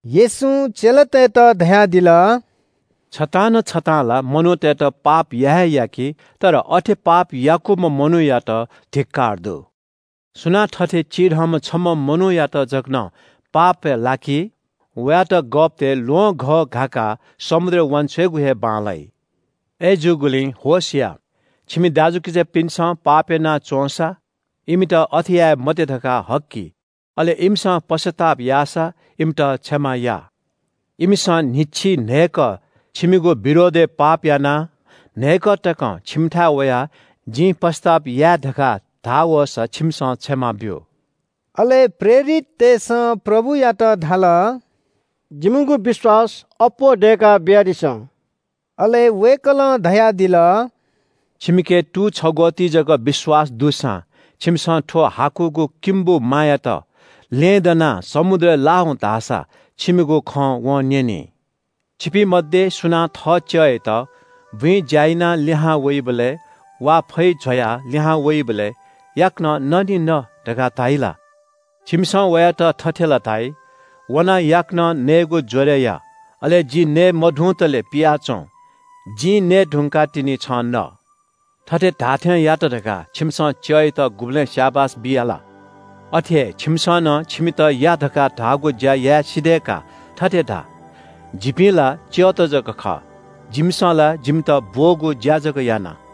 येशूं चेलातय्‌त धयादिल – “छतां न छतां ला मनूतय्‌त पाप या हे याकी, तर अथे पाप याकूम्‍ह मनूयात धिक्‍कार दु। सुनां थथे चिधंम्‍ह छम्‍ह मनूयात जक नं पापय् लाकी, वयात गःपतय् ल्‍वहंघः घाकाः समुद्रय् वांछ्वयेगु हे बांलाइ। अय्‌जूगुलिं होश या। “छिमि दाजुकिजापिन्‍सं पाप याना च्‍वंसा इमित अथे याये मते धकाः हक्‍कि। अले इमिसं पश्‍चाताप याःसा इमित क्षमा या। इमिसं न्‍हिच्‍छिइ न्‍हय्‌कः छिमिगु विरोधय् पाप यानाः न्‍हय्‌कः तकं छिमिथाय् वयाः ‘जिं पश्‍चाताप याये’ धकाः धाः वःसा छिमिसं क्षमा ब्‍यु।” अले प्रेरिततय्‌सं प्रभुयात धाल – “जिमिगु विश्‍वास अप्‍वः दय्‌का बियादिसँ।” अले वय्‌कलं धयादिल – “छिमिके तू छग्‍वःति जक विश्‍वास दुसां छिमिसं थ्‍व हाकुगु किम्‍बु मायात – ‘ल्‍यहेँ दनाः समुद्रय् ला हुँ’ धाःसा छिमिगु खँ वं न्‍यनी।” “छिपिं मध्‍ये सुनां थः च्‍यःयात बुँइ ज्‍या यानाः लिहां वइबलय् वा फैजवाः लिहां वइबलय् ‘याकनं न निं न’ धकाः धाइ ला? छिमिसं वयात थथे ला धाइ – ‘वनाः याकनं नयेगु ज्‍वरय् या, अले जि नये मधुंतले पियाच्‍वँ। जिं नये धुंकाः तिनि छं न।’ थथे धाःथें यात धकाः छिमिसं च्‍यःयात गुबलें स्‍याबास बिया ला? अथे हे छिमिसं नं छिमित या धकाः धाःगु ज्‍या याये सिधय्‌का थथे धा – ‘जिपिं ला च्‍यःत जक खः। जिमिसं ला जिमित ब्‍वःगु ज्‍या जक याना।’”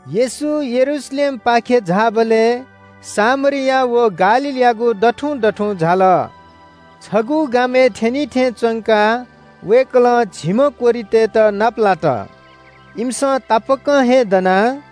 येशू यरूशलेमपाखे झाःबलय् सामरिया व गालीलयागु दथुं दथुं झाल। छगू गामय् थ्‍यनी थें च्‍वंकाः वय्‌कलं झिम्‍ह कोह्रितय्‌त नापलात। इमिसं तापाकं हे दनाः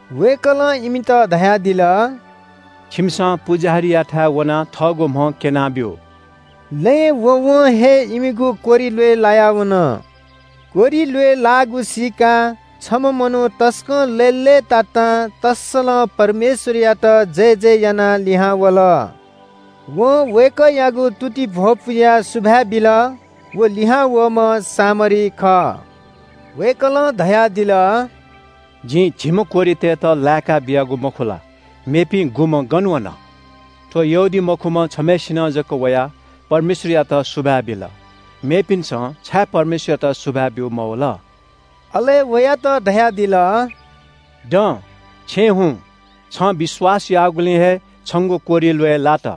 वय्‌कलं इमित धयादिल – “छिमिसं पुजाहारीयाथाय् वनाः थःगु म्‍ह क्‍यनाब्‍यु।” लँय् वँवं हे इमिगु कोह्रि ल्‍वय् लाया वन। कोह्रि ल्‍वय् लाःगु सीकाः छम्‍ह मनू तसकं लय्‌लय्‌तातां तःसलं परमेश्‍वरयात जयजय यानाः लिहां वल। वं वय्‌कःयागु तुतिइ भ्‍वपुयाः सुभाय् बिल। व लिहां वःम्‍ह सामरी खः। वय्‌कलं धयादिल – “जिं झिम्‍ह कोह्रितय्‌त लाय्‌का बियागु मखु ला? मेपिं गुम्‍ह गन वन? थ्‍व यहूदीमखुम्‍ह छम्‍हय्‌सिनं जक वयाः परमेश्‍वरयात सुभाय् बिल, मेपिन्‍सं छाय् परमेश्‍वरयात सुभाय् ब्‍यू मवल?” अले वयात धयादिल – “दँ, छेँय् हुँ। छं विश्‍वास याःगुलिं हे छंगु कोह्रि ल्‍वय् लात।”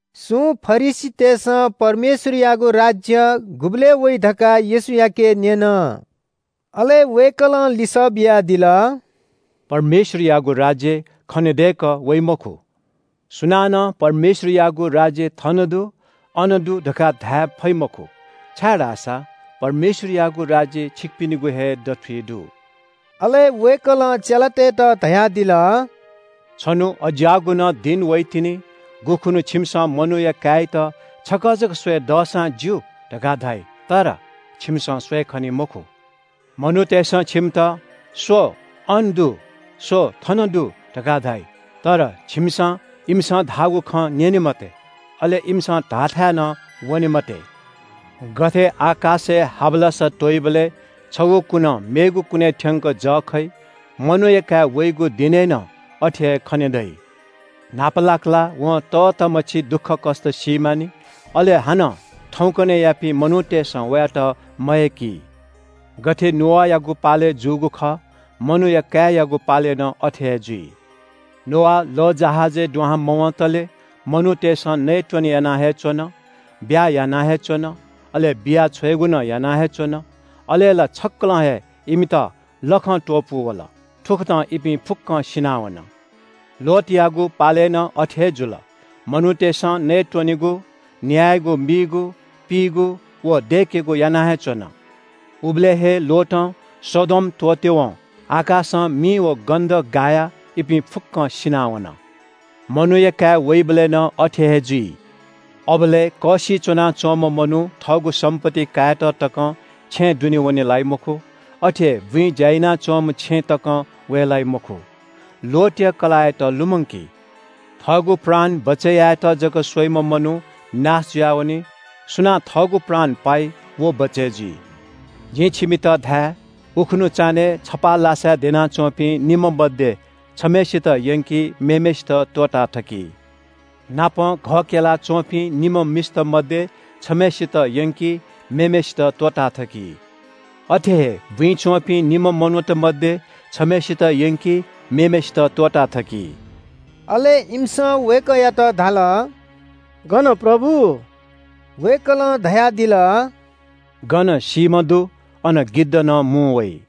सुं फरिसीतय्‌सं परमेश्‍वरयागु राज्‍य गुबलय् वइ धकाः येशूयाके न्‍यन। अले वय्‌कलं लिसः बियादिल – “परमेश्‍वरयागु राज्‍य खनेदय्‌कः वइ मखु। सुनानं परमेश्‍वरयागु राज्‍य ‘थन दु’, ‘अन दु’ धकाः धाये फइ मखु, छाय्‌धाःसा परमेश्‍वरयागु राज्‍य छिकपिनिगु हे दथुइ दु।” अले वय्‌कलं चेलातय्‌त धयादिल – “छन्‍हु अज्‍याःगु नं दिं वइतिनि गुखुन्‍हु छिमिसं मनूया काय्‌यात छकः जक स्‍वये दःसां ज्‍यू, धकाः धाइ। तर छिमिसं स्‍वये खनी मखु। मनूतय्‌सं छिमित – ‘स्‍व, अन दु’, ‘स्‍व, थन दु’ धकाः धाइ। तर छिमिसं इमिसं धाःगु खँ न्‍यने मते, अले इमिसं धाःथाय् नं वने मते। गथे आकाशय् हावलासा त्‍वइबलय् छगू कुनं मेगु कुनय् थ्‍यंक जः खइ। मनूया काय् वइगु दिनय् नं अथे हे खने दइ। न्‍हापालाक ला वं तःतामछि दुःखकष्‍ट सी मानि। अले हानं थौंकन्‍हय्‌यापिं मनूतय्‌सं वयात मयय्‌की। “गथे नोआयागु पालय् जूगु खः मनूया काय्‌यागु पालय् नं अथे जुइ। नोआ लःजहाजय् दुहां मवंतले मनूतय्‌सं नयेत्‍वने याना हे च्‍वन, ब्‍याहा याना हे च्‍वन, अले बिया छ्वयेगु नं याना हे च्‍वन, अले ला छक्‍कलं हे इमित लखं त्‍वपू वल, थुकथं इपिं फुक्‍कं सिनावन। “लोतयागु पालय् नं अथे हे जुल। मनूतय्‌सं नयेत्‍वनेगु, न्‍यायेगु मीगु, पीगु व दय्‌केगु याना हे च्‍वन। उबलय् हे लोतं सदोम त्‍वःतेवं आकाशं मि व गन्‍धक गायाः इपिं फुक्‍कं सिनावन। मनूया काय् वइबलय् नं अथे हे जुइ। अबलय् कःसिइ च्‍वनाच्‍वंम्‍ह मनू थःगु सम्‍पत्ति कायेत तकं छेँय् दुने वने लाइ मखु। अथे हे बुँइ ज्‍या यानाच्‍वंम्‍ह छेँय् तकं वये लाइ मखु। लोतया कलाःयात लुमंकी। थःगु प्राण बचय् यायेत जक स्‍वइम्‍ह मनू नाश जुयावनी। सुनां थःगु प्राण पाइ व बचय् जुइ। जिं छिमित धाये – उखुन्‍हु चान्‍हय् छपाः लासाय् द्यनाच्‍वंपिं निम्‍ह मध्‍ये छम्‍हय्‌सित यंकी, मेम्‍हय्‌सित त्‍वःताथकी। नापं घः क्‍यला च्‍वंपिं निम्‍ह मिस्‍त मध्‍ये छम्‍हय्‌सित यंकी, मेम्‍हय्‌सित त्‍वःताथकी। अथे हे बुँइ च्‍वंपिं निम्‍ह मनूत मध्‍ये छम्‍हय्‌सित यंकी, मेम्‍हय्‌सित त्‍वःताथकी।” अले इमिसं वय्‌कःयात धाल – “गन प्रभु?” वय्‌कलं धयादिल – “गन सीम्‍ह दु अन गिद्ध नं मुं वइ।”